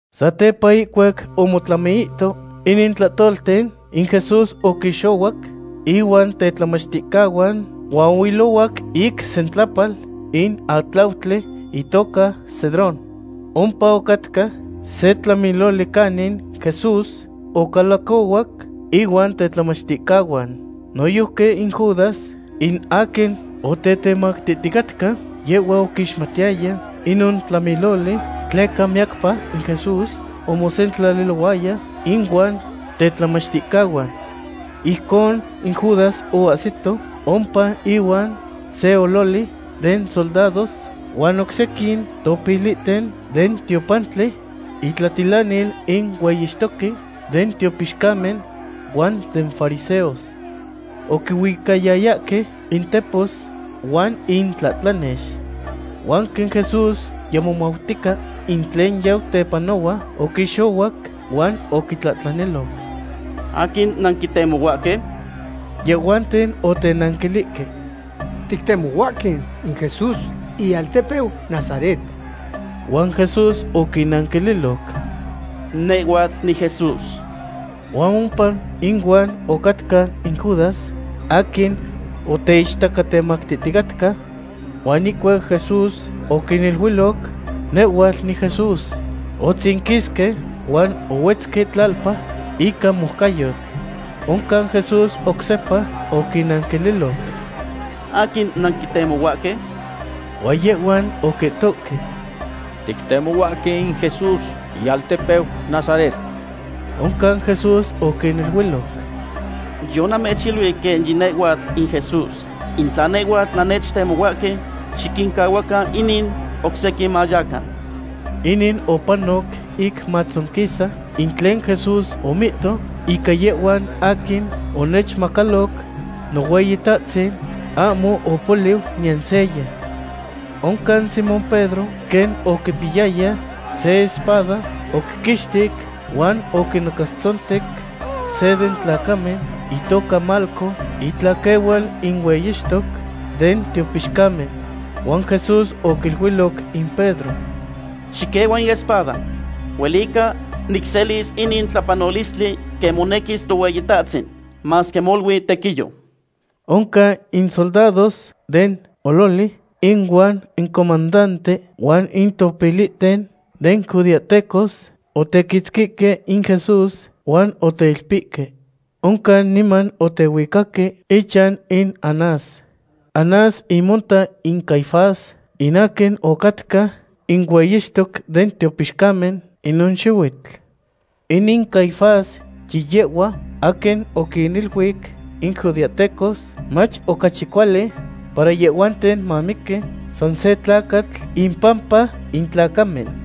Satepa ihcuac omotlamiihto inin tlahtolten, in Jesús oquixohuac inuan tetlamachticahuan huan ohuilohuac ic sentlapal in atlautli itoca Cedrón. Ompa ocatca se tlamiloli canin Jesús ocalacohuac ihuan tetlamachticahuan. Noyojqui in Judas, in aquin otetemactihticatca, yehhua oquixmatiyaya inon tlamiloli, tleca miyacpa in Jesús omosentlalilohuaya inuan tetlamachticahuan. Ijcon in Judas oahsito ompa ihuan se ololi den soldados huan oc sequin topilihten den tiopantli, intlatitlanil in hueyixtoque den tiopixcamen huan den fariseos. Oquihuicayayahque intepos huan intlahtlanex. Huan quen Jesús yimomautica in tlen yau tepanohua, oquixohuac huan oquitlahtlaniloc: ―¿Aquin nanquitemohuahque? Yehhuanten otenanquilihque: ―Tictemohuahque in Jesús ialtepeu Nazaret. Huan Jesús oquinnanquililoc: ―Nehhuatl niJesús. Huan ompa inuan ocatca in Judas, aquin oteichtacatemactihticatca. Huan ihcuac Jesús oquiniluiloc: “Nehhuatl niJesús”, omotzinquisque huan ohuetzque tlalpa ica moucayotl. Oncan Jesús oc sepa oquintlahtlaniloc: ―¿Aquin nanquitemohuahque? Huan yehhuan oquihtohque: ―Tictemohuahque in Jesús ialtepeu Nazaret. Oncan Jesús oquiniluiloc: ―Yonamechiluic quen yinehhuatl in Jesús. In tla nehhuatl nannechtemohuahque, xiquincahuacan inin oc sequin mayacan. Inin opanoc ic matzonquisa in tlen Jesús omihto: “Ica yehhuan aquin onechmacaloc, Nohueyitahtzin, ahmo opoliu niyan seya.” Oncan Simón Pedro, quen oquipiyaya se espada, oquiquixtic huan oquinacastzontec se den tlacamen itoca Malco, itlaquehual in hueyixtoc den tiopixcamen. Huan Jesús oquiluiloc in Pedro: ―Xiquehua in espada. Huelica nicselis inin tlapanolistli quen monequis Tohueyitahtzin, masque molui tequiyo. Oncan in soldados den ololi, ihuan incomandante, huan in topilihten den judeahtecos otequitzquihque in Jesús huan oteilpihque. Oncan niman otehuicaque ichan in Anás. Anás imonta in Caifás, in aquin ocatca in hueyixtoc den tiopixcamen inon xihuitl. Inin Caifás yiyehhua aquin oquiniluic in judeahtecos mach ocachi cuali para yehhuanten mamiqui san se tlacatl impampa in tlacamen.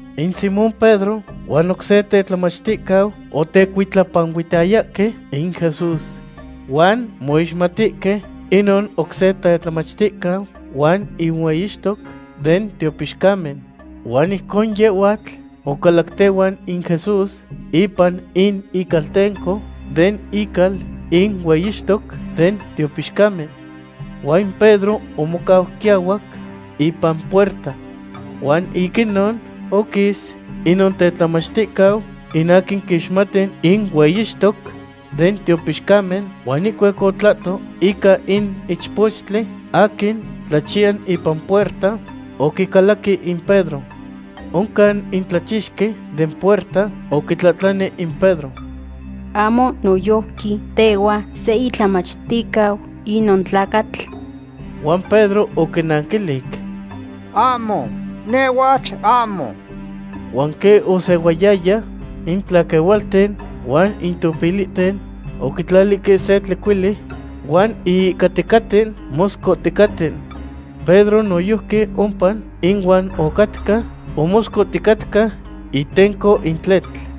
In Simón Pedro huan oc se tetlamachticau otecuitlapanuihtayahque in Jesús. Huan moixmatihque inon oc se tetlamachticau huan in hueyixtoc den tiopixcamen. Huan ijcon yehhuatl ocalac tehuan in Jesús ipan in icaltenco den ical in hueyixtoc den tiopixcamen. Huan in Pedro omocau quiahuac, ipan puerta. Huan ic inon oquis inon tetlamachticau, in aquin quixmati in hueyixtoc den tiopixcamen, huan ihcuac otlahto ica in ichpochtli aquin tlachiya ipan puerta, oquicalaqui in Pedro. Oncan in tlachixqui den puerta oquitlahtlani in Pedro: ―¿Ahmo noyojqui tehhua se itlamachticau inon tlacatl? Huan Pedro oquinanquilic: ―Ahmo, nehhuatl ahmo. Huan quen osehuayaya, in tlaquehualten huan in topilihten oquitlalihque se tlecuili huan ihihcaticaten moscohticaten. Pedro noyojqui ompa inuan ocatca, omoscohticatca itenco in tletl.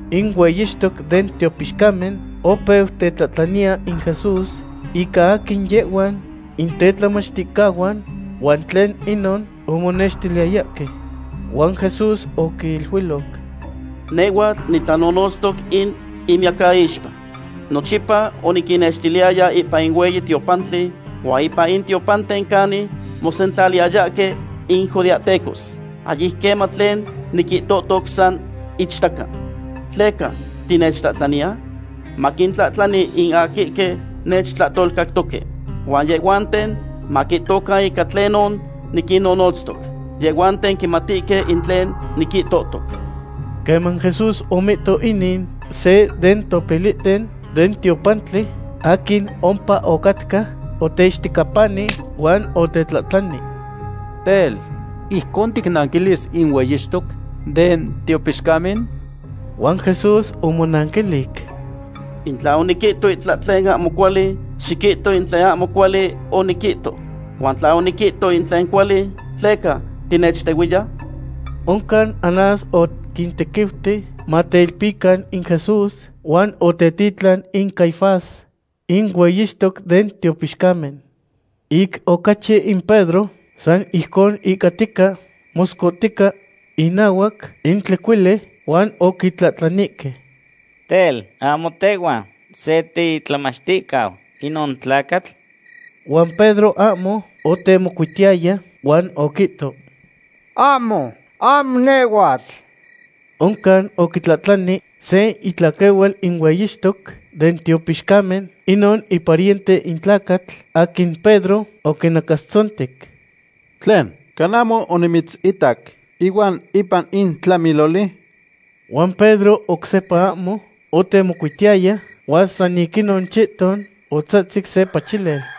In hueyixtoc den tiopixcamen opeu tetlahtlaniya in Jesús ica aquin yehhuan in tetlamachticahuan huan tlen inon omonextiliyayahque. Huan Jesús oquiluiloc: ―Nehhuatl nitlanonotztoc in miyacaixpa. Nochipa oniquinnextiliyaya ipan in hueyi tiopantli huan ipan in tiopanten canin mosentlaliyayahque in judeahtecos. Ahyic queman tlen niquihtohtoc san ichtaca. ¿Tleca tinechtlahtlaniya? Maquintlahtlani in aquihque nechtlahtolcactoque, huan yehhuanten maquihtocan ica tlenon niquinnonotztoc. Yehhuanten quimatihque in tlen niquihtohtoc. Queman Jesús omihto inin, se den topilihten den tiopantli aquin ompa ocatca, oteixtecapani huan otetlahtlani: ―Tel, ¿ijcon ticnanquilis in hueyixtoc den tiopixcamen? Huan Jesús omonanquilic: ―In tla oniquihto itlahtlen ahmo cuali, xiquihto in tlen ahmo cuali oniquihto; huan tla oniquihto in tlen cuali, ¿tleca tinechtehuiya? Oncan Anás oquintequiuti mateilpican in Jesús, huan otetitlan in Caifás, in hueyixtoc den tiopixcamen. Ic ocachi in Pedro san ijcon ihcatica moscohtica inahuac in tlecuili, huan oquitlahtlanihque: ―Tel, ¿ahmo tehhua se titlamachticau inon tlacatl? Huan Pedro ahmo otemocuitiyaya, huan oquihto: ―Ahmo, ahmo nehhuatl. Oncan oquitlahtlani se itlaquehual in hueyixtoc den tiopixcamen, inon ipariente in tlacatl aquin Pedro oquinacastzontec: ―¿Tlen, cana ahmo onimitzitac ihuan ipan in tlamiloli? Huan Pedro oc sepa ahmo otemocuitiyaya, huan san ic inon chihton otzahtzic se pachilel.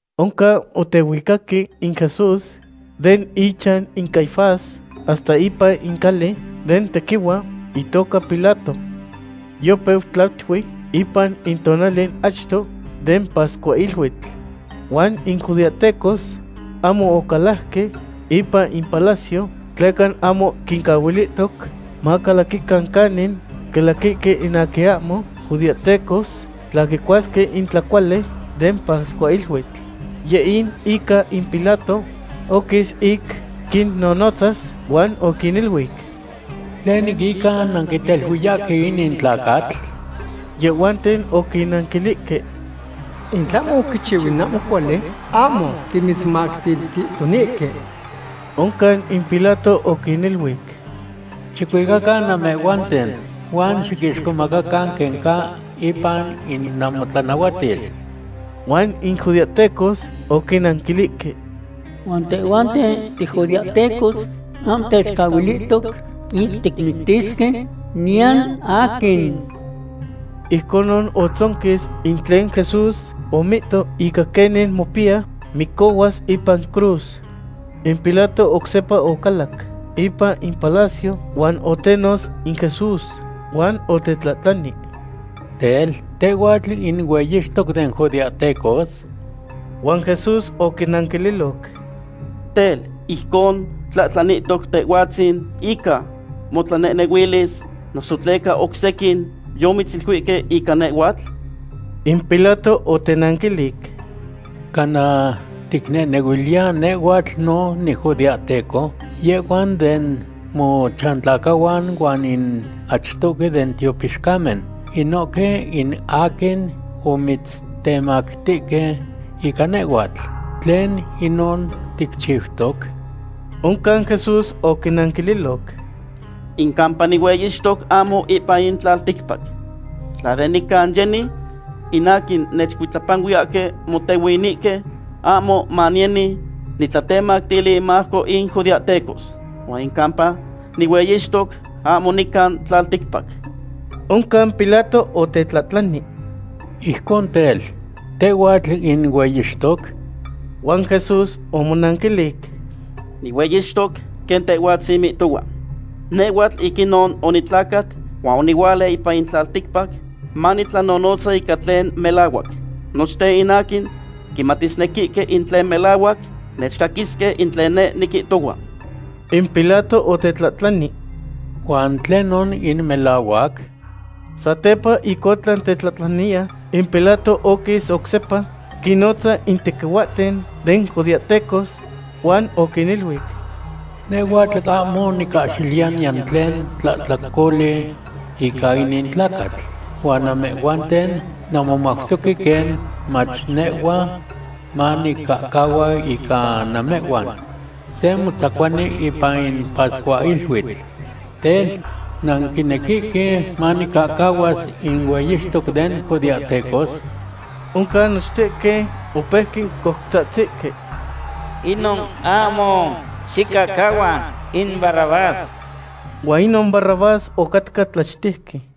Oncan otehuicaque in Jesús den ichan in Caifás hasta ipan in cali den tequihua, itoca Pilato. Yopeu tlatui ipan in tonali achto den pascuahiluitl. Huan in judeahtecos ahmo ocalajque ipan in palacio, tleca ahmo quincahuilihtoc macalaquican canin calaquihque in aquin ahmo judeahtecos tla quicuasque in tlacuali den pascuahiluitl. Yeh in ica in Pilato oquis ic quinnonotzas, huan oquiniluic: ―¿Tlen ica nanquiteluiyahque inin tlacatl? Yehhuanten oquinanquilihque: ―In tlahmo oquichiu in ahmo cuali, ahmo timitzmactilihtonihque. Oncan in Pilato oquiniluic: ―Xicuicacan namehhuanten, huan xiquixcomacacan quen ca ipan in namotlanahuatil. Huan in judeahtecos oquinanquilihque: ―Huan tehhuanten tijudeahtecos ahmo techcahuilihtoc ic ticmictisque niyan aquin. Ijconon otzonquis in tlen Jesús omihto ica quenin mopiya micohuas ipan cruz. In Pilato oc sepa ocalac ipan in ipalacio, huan otenotz in Jesús huan otetlahtlani: ―Tel, ¿tehhuatl in hueyixtoc den judeahtecos? Huan Jesús oquinanquililoc: ―Tel, ¿ijcon tlahtlanilohtoc tehhuatzin ica motlanehnehuilis, noso tleca oc sequin yomitziluihque ica nehhuatl? In Pilato otenanquilic: ―¿Cana ticnehnehuiliya nehhuatl no nijudeahteco? Yehhuan den mochantlacahuan huan in achtohque den tiopixcamen, inohque in aquin omitztemactihque ica nehhuatl. ¿Tlen inon ticchiutoc? Oncan Jesús oquinanquililoc: ―In campa nihueyixtoc ahmo ipan in tlalticpac. Tla de nican yeni, in aquin nechcuitlapanuiyahque motehuinihque, ahmo maniyeni nitlatemactili inmajco in judeahtecos. Huan in campa nihueyixtoc ahmo nican tlalticpac. Oncan Pilato otetlahtlani: ―Ijcon tel, ¿tehhuatl in hueyixtoc? Huan Jesús omonanquilic: ―Nihueyixtoc, quen tehhuatzin mihtohua. Nehhuatl ic inon onitlacat huan onihuala ipan in tlalticpac manitlanonotza ica tlen melahuac. Nochten in aquin quimatisnequihque in tlen melahuac nechcaquisque in tlen neh niquihtohua. In Pilato otetlahtlani: ―¿Huan tlenon in melahuac? Satepa ic otlan tetlahtlaniya, in Pilato oquis oc sepa quinnotza in tequihuahten den judeahtecos huan oquiniluic: ―Nehhuatl ahmo nicahxiliya niyan tlen tlahtlacoli ica inin tlacatl. Huan namehhuanten nanmomautoque quen mach nehhua manicahcahua ica namehhuan se motzacuani ipan in pascuahiluitl. Tel, ¿nanquinequihque manicahcahuas in hueyixtoc den judeahtecos? Oncan nochtehque opeuque coutzahtzihque: ―¡Inon ahmo! ¡Xicahcahua in Barrabás! Huan inon Barrabás ocatca tlachtejqui.